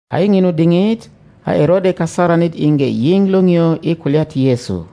A i ŋinu diŋit a Erode kasaranit iŋge yiŋ liŋio i kulya ti Yesu,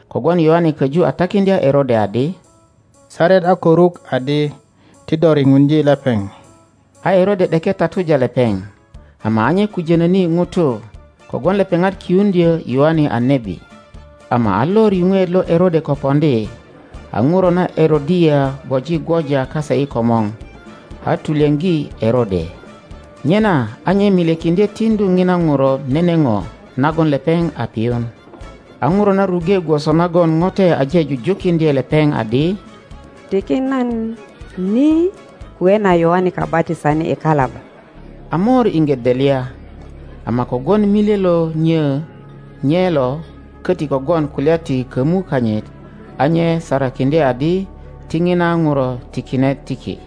kogwon Yoane köju a takiŋdya Erode adi, Saret a ko ruk adi ti do riŋuŋdye lepeŋ. A Erode ’deke tatuja lepeŋ, ama a nye kujönöni ŋutu, kogwon lepeŋat kiuŋdyö Yoane a nebi. Ama a lor yuŋweet lo Erode ko poŋdi, a ŋuro na Erodia gwoji gwoja kase i komor, a tulyoŋgi Erode, nyena a nye milyekiŋdye tiŋdu ŋina ŋuro nene ŋo nagon lepeŋ a piyun. A ŋuro na ruŋge gwoso nagon ŋote aje jujukiŋdye lepeŋ adi, Tiki nan ni kwe na Yoane Kabatisanit i kalaba. a mor iŋge delya, ama kogwon milye lo nyo nye lo, koti kogwon kulya ti kömu kanyit, a nye sarakiŋdye adi ti ŋina ŋuro tikine tiki.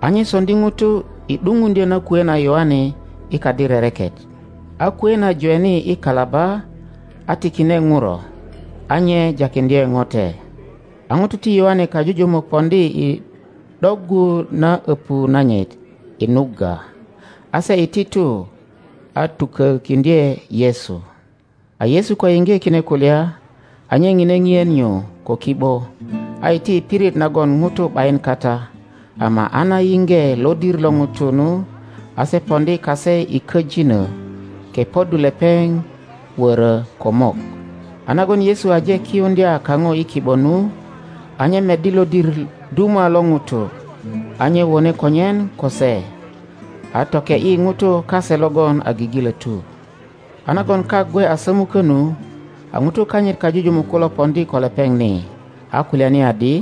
A nye soŋdi ŋuto i ’dupuŋdyö na kwe na Yoane i kadi rereket. A kwe na jweni i kalaba a tikine ŋuro, a nye jakiŋdye ŋote. A ŋutu ti Yoane kajujumuk poŋdi i ’doggu na öpu nanyit i nugga; a se iti tu a tukökiŋdye Yesu. A Yesu ko yiŋge kine kulya, a nye ŋine ŋien nyu ko ki ’bo, a iti i pirit nagon ŋutu ’bayin kata. Ama a na yiŋge lodir lo ŋutu nu, a se poŋdi kase i köjino, kepoddu lepeŋ wöro ko mok. A nagon Yesu aje kiyuŋdya kaŋo i ki ’bo nu, a nye meddi lodir duma lo ŋutu; a nye wone konyen ko se, a toke ’yi ŋutu kase logon a gigilotu. A nagon kak gwe a sömukö nu, a ŋutu kanyit kajujumuk kulo poŋdi ko lepeŋ ni, a kulyani adi,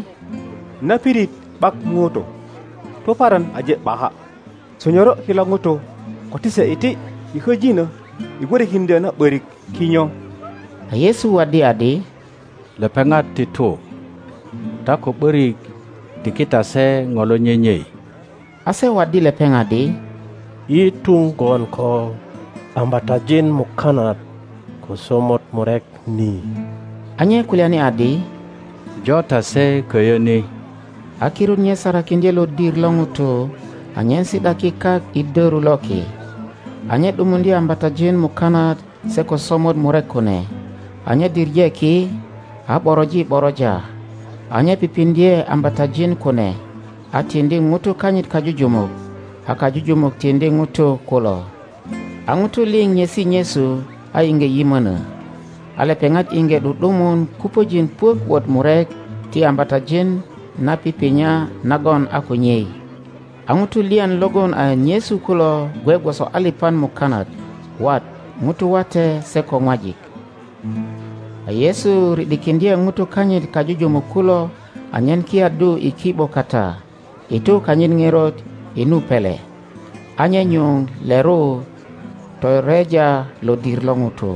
Na pirit ’bak ŋutu, tuparan aje ’baka. Sonyoro kilo ŋutu ko ti se iti i köjinö i gwörökiŋdyö na ’börik kinyo. A Yesu waddi adi, Lepeŋat ti tu. Ta ko ’borik tiki ta se ŋo lo nyenyei. A se waddi lepeŋ adi, Yi tuŋ gwon ko ambatajin mukanat ko somot murek ni. A nye kulyani adi, Jo ta se köyö ni. A kirut nye sarakiŋdye lodir lo ŋutu anyen si ’daki kak i doru loki. A nye ’dumuŋdye ambatajin mukanat se ko somot murek kune, a nye diŋe ki, a ’boroji ’boroja, a nye pipiŋdye ambatajin kune, a tiŋdi ŋutu kanyit kajujumuk, a kajujumuk tiŋdi ŋutu kulo. a ŋutu liŋ nyesi nyesu a iŋge yimönö. A lepeŋat iŋge ’du ’dumun kupöjin puök wot murek ti ambatajin na pipinya nagon a ko nyei. A ŋutu lyan logon a nyesu kulo gwe gwoso alipan mukanat, wat ŋutu wate se ko ŋwajik. A Yesu ri ’dikiŋdye ŋutu kanyit kajujumuk kulo anyen kiyaddu i ki ’bo kata i tu kanyit ŋerot i nu pele, a nye nyuŋ leru toreja lodir lo ŋutu.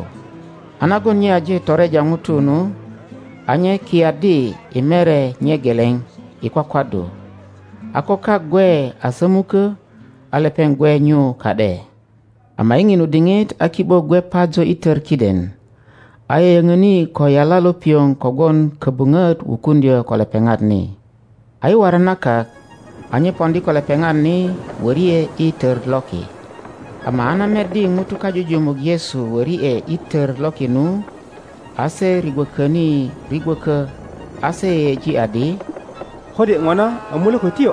a nagon nye aje toreja ŋutu nu, a nye ki yaddi i mere nye geleŋ i kwakwaddu. A ko kak gwe a sömukö, a lepeŋ gwe nyu ka ’de. Ama i ŋinu diŋit a ki ’bo gwe pajo i tör kiden, a yoyöŋoni ko yala lo pioŋ kogwon kobuŋot wukuŋdyö ko lepeŋat ni. A i waran na kak, a nye poŋdi ko lepeŋat ni wöri ’e i tör loki. Ama a na meddi ŋutu kajujumuk Yesu wöri ’e i tör loki nu, a se rigwököni rigwökö, a se yeyeji adi kode ŋona a mulökötyo!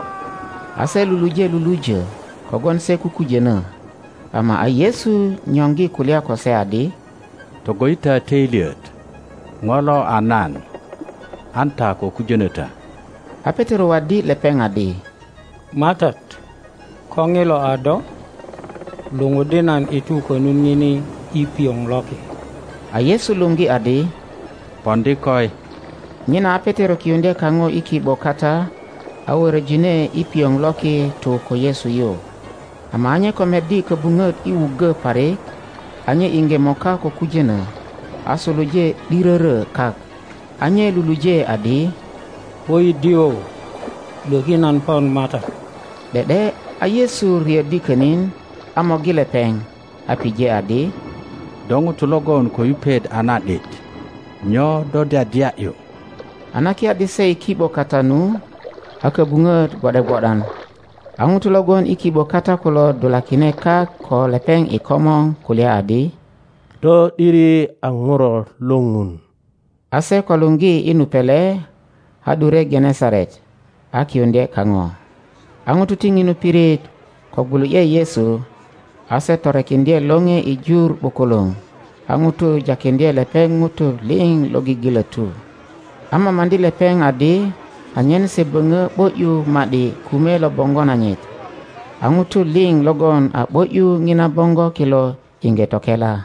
A se luluje lulujö kogwon se kukujönö, Ama a Yesu nyoŋgi kulya ko se adi, Togo ’yi ta töilyet, ŋo lo a nan; an ta ko kujönö ta. a Petero waddi lepeŋ adi, MATAT, ko ŋilo a do, luŋuddi nan i tu konut ŋini i pioŋ loki. A Yesu luŋgi adi, Poŋdi koi. Nyena a Petero kiyuŋdye kaŋo i ki ’bo kata, a wöröjine i pioŋ loki tu ko Yesu yu. Ama a nye ko meddi köbuŋöt i wuggö parik, a nye iŋge moka ko kujönö, a suluje ’dirörö kak, a nye luluje adi, Woidio, lwöki nan pon MATAT! ’De ’de a Yesu riöddi könin, a morgi lepeŋ, a pije adi, Do ŋuto logon ko yupet a na ’dit! Nyo do dyadya ’yu? A na kiyaddi se i ki ’bo kata nu, a köbuŋöt gwo ’de gwo’dan. A ŋutu lo gwon i ki ’bo kata kulo dulakine kak ko lepeŋ i komor kulya adi, Do ’diri a Ŋuro lo Ŋun. A se ko laŋgi i nu pele, a ’dure Genesaret a kiyuŋdye kaŋo. a ŋutu ti ŋinu pirit ko gwulu ’ye Yesu, a se torekiŋdye lore i jur ’bukuluŋ, a ŋutu jakiŋdye lepeŋ ŋutu liŋ lo gigilotu, a mamaŋdi lepeŋ adi anyen se böŋö ’bo ’yu ma ’di kume lo boŋgo nanyit. A ŋutu liŋ logon a ’bo ’yu ŋina boŋgo kilo iŋge tokela.